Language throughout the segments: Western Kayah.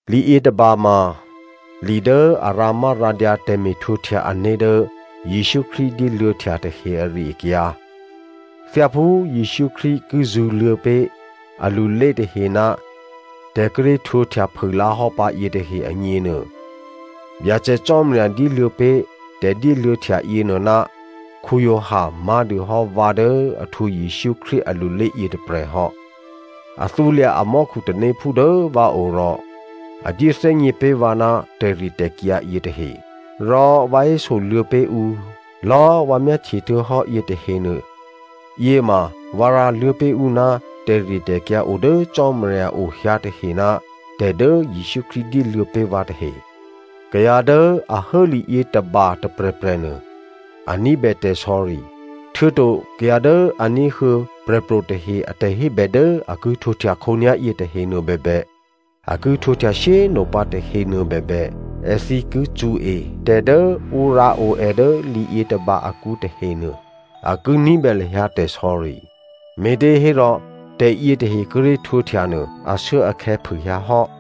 Li yětôba ma li dố a rǎmárǎdyǎ tè̤me̤htwǒhtya ané̤ dố Jesǔ Krístu dyéluô̌htya tahe ari-akyǎ. Thyáphú Jesǔ Krístu ki zṳ̌luô̌ pé̤ alulé tahe ná tè̤ kíré̤ htwǒhtya phûlǎhò́ pǎ yětahe agněnuô, Byacè Cò́marya dyéluô̌ pé̤ tè̤dyéluô̌htya yěnuô ná Giovanni má̤dû hò́ vǎ dố a htwǒ Jesǔ Krístu alulé yětôprè̤ hò́. A thǔlya̤ a mò́khu tanéphú dố vǎo rò a dyéthè́gně pé̤ vǎ ná tè̤ritè̤kyǎ yětahe. Rò vǎ hésoluô̌ pé̤ ǔ lò̌꤮ vǎ myáhtye htuô̌hò́ yětahenuô, yěma vǎ rǎluô̌ pé̤ ǔ ná tè̤ritè̤kyǎ o dố Cò́marya o hyǎ tahe ná tè̤dố Jesǔ Krístu dyéluô̌ pé̤ vǎ tahe. Kayǎ dố a hố li yětôba tôprè̤prè̤ nuô, a ní̤bè tè̤sò̌ri htuô̌to kayǎ dố a ní̤huô̌ prè̤pro̤ tahe a tè̤hébè dố a ki htwǒhtya khǒnyá̤ yětahenuô bèbè, a ki htwǒhtya shyé꤮ nopǎ tahenuô bèbè, èthǐ ki cṳ̌e tè̤dố ǔ rǎo è dố li yětôba akǔ tahenuô, a ki ní̤bè lahyǎ tè̤sò̌ri, me̤těhérò tè̤yětahe kíré̤ htwǒhtyanuô, ashuốakhè̌ phûhyǎ hò́.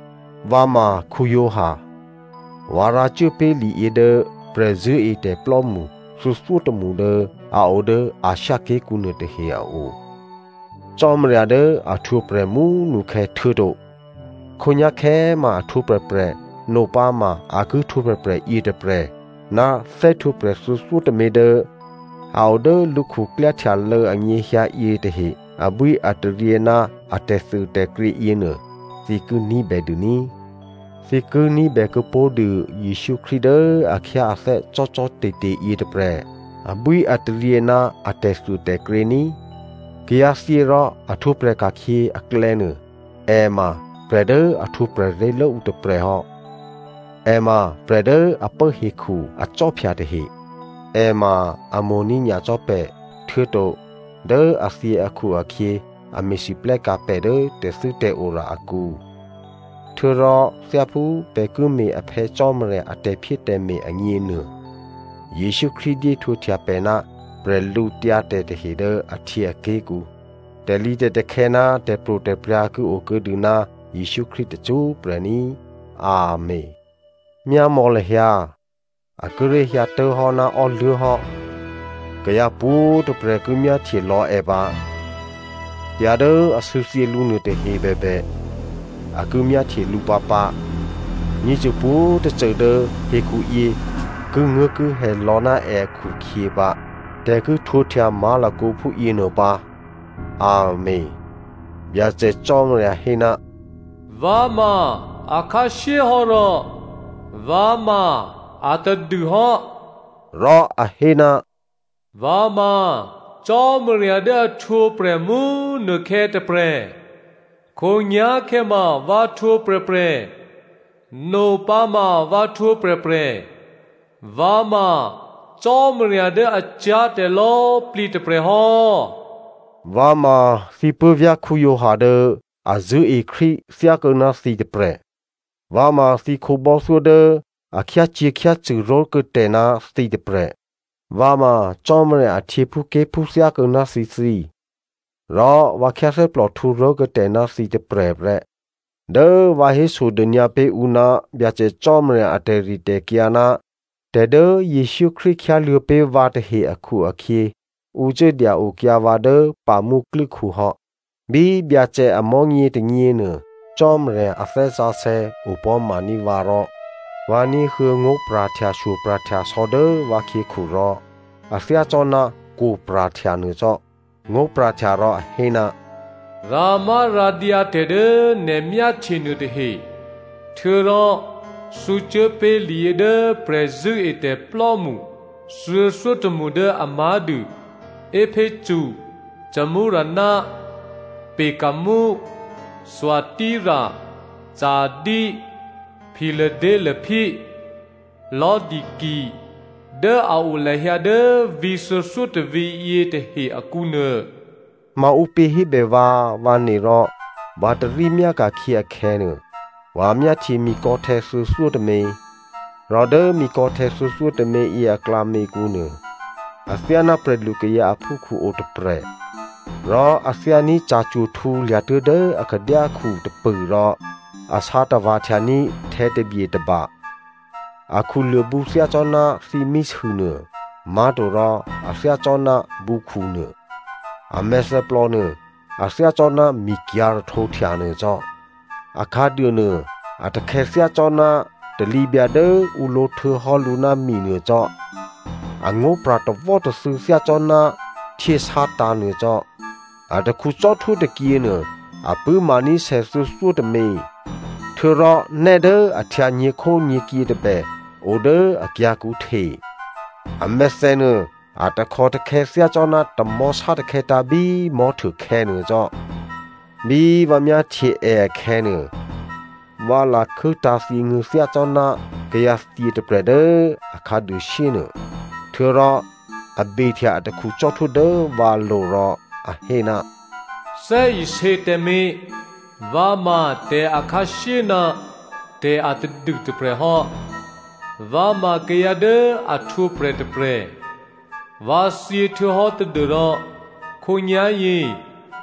Vǎ ma Giovanni. Vǎ rǎcuố pé̤ liyě dố prè̤zṳ̂́etè̤plò́mṳ thuô̌thyótômṳ dố a o dố Asia ké̤kǔ nuôtahe a o. Cò́marya dố a htwǒprè̤ mú꤮ nukhè̌, htuô̌to khǒnyá̤khè̌꤮ ma a htwǒprè̤prè̤, nopǎ ma a ki htwǒprè̤prè̤ yětôprè̤ ná thè́htwǒprè̤ thuô̌thyótômě dố a o dố lǔ khuklyáhtyalô̌ anyěhyǎ yětahe abwíataryě ná a tè̤thuôtè̤krě yěnuô, thǐ ki ní̤bèdû ní꤮. Thǐ ki ní̤bè kuô̌pó̤dû Jesǔ Krístu dố a khyáathè́ cò́cò́te̤te̤ yětôprè̤ abwíataryě ná a tè̤thuôtè̤krě ní꤮. Kayǎthyě rò a htwǒprè̤ ka̤khyě aklè̌nuô, è ma prè̤ dố a htwǒprè̤ ré̤lố ǔ tôprè̤ hò́. È ma prè̤ dố a pố hekhu akhwí tahe. È ma a mo̤ní̤ nyacò́ pè̤ htuô̌to dố a thyě akhu-akhyě a me̤lwóhteka̤ pè̤ dố tè̤thû́tè̤ora akǔ. Htuô̌rò thyáphú pè̤ ki me̤ a Phè̌ Cò́marya a tè̤phyétè̤me̤ agněnuô, Jesǔ Krístu dyéhtwǒhtya pè̤ ná bwídu tahe dố ahtyěaké̤kǔ. Tè̤lǐtè̤takhè̌ ná tè̤pro̤tè̤prya̤ ki o kuô̌dû ná Jesǔ Krístu tacṳ́prè̤ ní꤮. Amèn. Myámò̌ lahyǎ, a kíré̤ hyǎtố̤hò́ ná ò́luố̤ hò́꤮. Kayǎ pwǒ̤꤮ tôprè̤ ki myáhtye lò̌ è pǎ. Kayǎ dố a sû̌thyě lǔ nuôtahe bèbè, a ki myáhtye lǔ pǎpǎ. Myěcô pwǒ̤꤮ tôcô dố hekhuyě kinguố̤kihè lò̌ ná è akhu-akhyě pǎ. Tè̤ ki htwǒhtya má̤lakǒ phúyěnuô pǎ꤮ Amèn. Byacè Cò́marya hé, “Vǎ ma akhǎshyé hò́ rò vǎ ma atadûhò́” rò a hé, “Vǎ ma Cò́marya dố a htwǒprè̤ mú꤮ nukhè̌ tôprè̤, khǒnyá̤khè̌ ma vǎ htwǒprè̤prè̤, nopǎma vǎ htwǒprè̤prè̤. Vǎ ma Cò́marya dố a cyá̤ tè̤lò̌꤮ plǐ tôprè̤hò́.” Vǎ ma thǐ puố̤vyá̤ Giovanni dố a zṳ̂́e Krístu thyákuô̌ ná thǐ tôprè̤. Vǎ ma thǐ khǒbò́thyó dố a khyácyě̤khyácṳ̂ ró̤kuô̌tè̤ ná thǐ tôprè̤, vǎ ma Cò́marya a htyěphúké̤phú thyákuô̌ ná thǐthǐ, rò vǎ khyáthè́plòhtǔ ró̤kuô̌tè̤ ná thǐ tôprè̤ prè́. Dố vǎ hésodônyǎ pé̤ ǔ ná Byacè Cò́marya a tè̤ritè̤kyǎ ná tè̤dố Jesǔ Krístu khyáluô̌ pé̤ vǎ tahe akhu-akhyě, ǔ cuố dya-okyǎ vǎ dố Patmo klû́khu hò́. Bí Byacè amò̤́nyě tônyěnuô Cò́marya a Thè́ Sǎsè̌ opò̤́maní̤ vǎ rò vǎ ní̤huô̌ ngó̤pra̤htyashyo pra̤htyasò̌ dố vǎkhyěkhu rò a thyácò́ná kwo̤ pra̤htya nuô cò́. Ngó̤pra̤htya rò a hé, “Rǎmárǎdyǎ tè̤dố nè̤ myáhtye nuôtahe. Htuô̌rò thǔcuốpé̤ liyě dố prè̤zṳ̂́etè̤plò́mṳ thuô̌thyótômṳ dố a má̤dû Epheso, Smyrna, Pergamum, Thyatira, Sardi, Philadelphia, Laodicea dố a o lahyǎ dố vǐ̤ thuô̌thyótôvǐ̤ yětahe akǔnuô.” Maǔpě hébè vǎ, vǎ ne rò vǎ tarí myáka̤khyě akhè̌nuô, vǎ myáhtye mikò̌htè̌ thuô̌thyótômě. Rò dố mikò̌htè̌ thuô̌thyótôměyě aklǎměkǔ nuô athyáná prè̤lukayǎ aphúkhǔ o tôprè̤. Rò a thyání̤ ca̤cwo̤ htǔlya̤tuố̤ dố akhadyákhu tôpṳ̂ rò a sǎ tava̤ htyaní̤ htè̌tabye tôba. Akhuluô̤ bǔ thyácò́ná thímísûnuô, má̤torò a thyácò́ná bǔkhu nuô. A mèthèplò nuô, a thyácò́ná mikyǎ̤ rahtǒhtya nuô cò́. Akhǎduô nuô a takhè̌ thyácò́ná talǐbyǎ dố ǔ lǒ htuô̌hò́ lǔ ná mi nuô cò́. Angó̤ pra̤ tawò́tathû̌ thyácò́ná htyě sátǎ̤ nuô cò́. Atakhu cò́htwó tôkyěnuô a pṳ̂́maní̤ sè thuô̌thyótômě. Htuô̌rò nè́ dố a htyǎ nyě̤khónyě̤kyě tôbè odố akyǎ̤kǔ hte. A mèthènuô a takhòtakhè̌ thyácò́ná tamò̤́ sátakhè̌tǎ̤ bí mò̤́htuôkhè̌ nuô cò́. Bí vǎ myáhtye è akhè̌nuô, vǎ lakhû́tǎ̤ thyěnguô̤̌ thyácò́ná kayǎthyě tôprè̤ dố a khǎduôshyé nuô, htuô̌rò a behtya atakhu cò́htwó dố vǎlo̤ rò a hé, “Thè́isě tǎmé̤, vǎ ma tè̤akhǎshyé ná tè̤atadû tôprè̤hò́. Vǎ ma kayǎ dố a htwǒprè̤ tôprè̤. Vǎ thyě htuô̌hò́ tadû́rò khǒnyá̤yě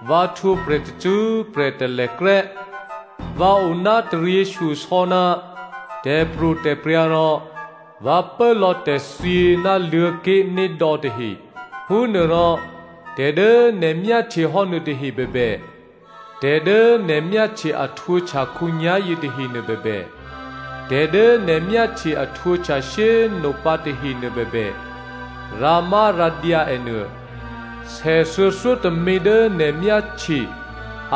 vǎ htwǒprè̤ tacṳ́prè̤ talèkrè́. Vǎ oná taryěshyosò̌ ná tè̤pro̤tè̤prya̤ rò vǎ pốlò̌ tè̤thyě ná Luô̤̌ké̤nédò̌ tahe. “Phúnuôrò tè̤dố nè̤ myáhtyehò́ nuôtahe bèbè, tè̤dố nè̤ myáhtye a htwǒhtya khǒnyá̤yě tahenuô bèbè, tè̤dố nè̤ myáhtye a htwǒhtya shyé꤮ nopǎ tahenuô bèbè, rǎmárǎdyǎ ènuô. Sè thuô̌thyótômě dố nè̤ myáhtye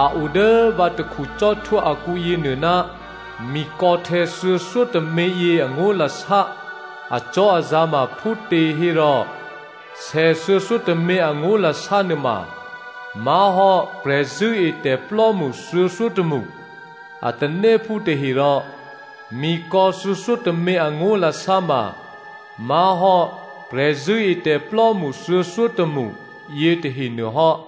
a o dố vǎ takhu cò́htwó akǔ yěnuô ná mikò̌htè̌ thuô̌thyótôměyě angó̤lasá acò́azǎ̤ ma phútěhérò sè thuô̌thyótômě angó̤lasá nuôma má̤hò́ prè̤zṳ̂́etè̤plò́mṳ thuô̌thyótômṳ a tanéphú tahe rò mikò̌ thuô̌thyótômě angó̤lasá ma má̤hò́ prè̤zṳ̂́etè̤plò́mṳ thuô̌thyótômṳ yětahenuô hò́.”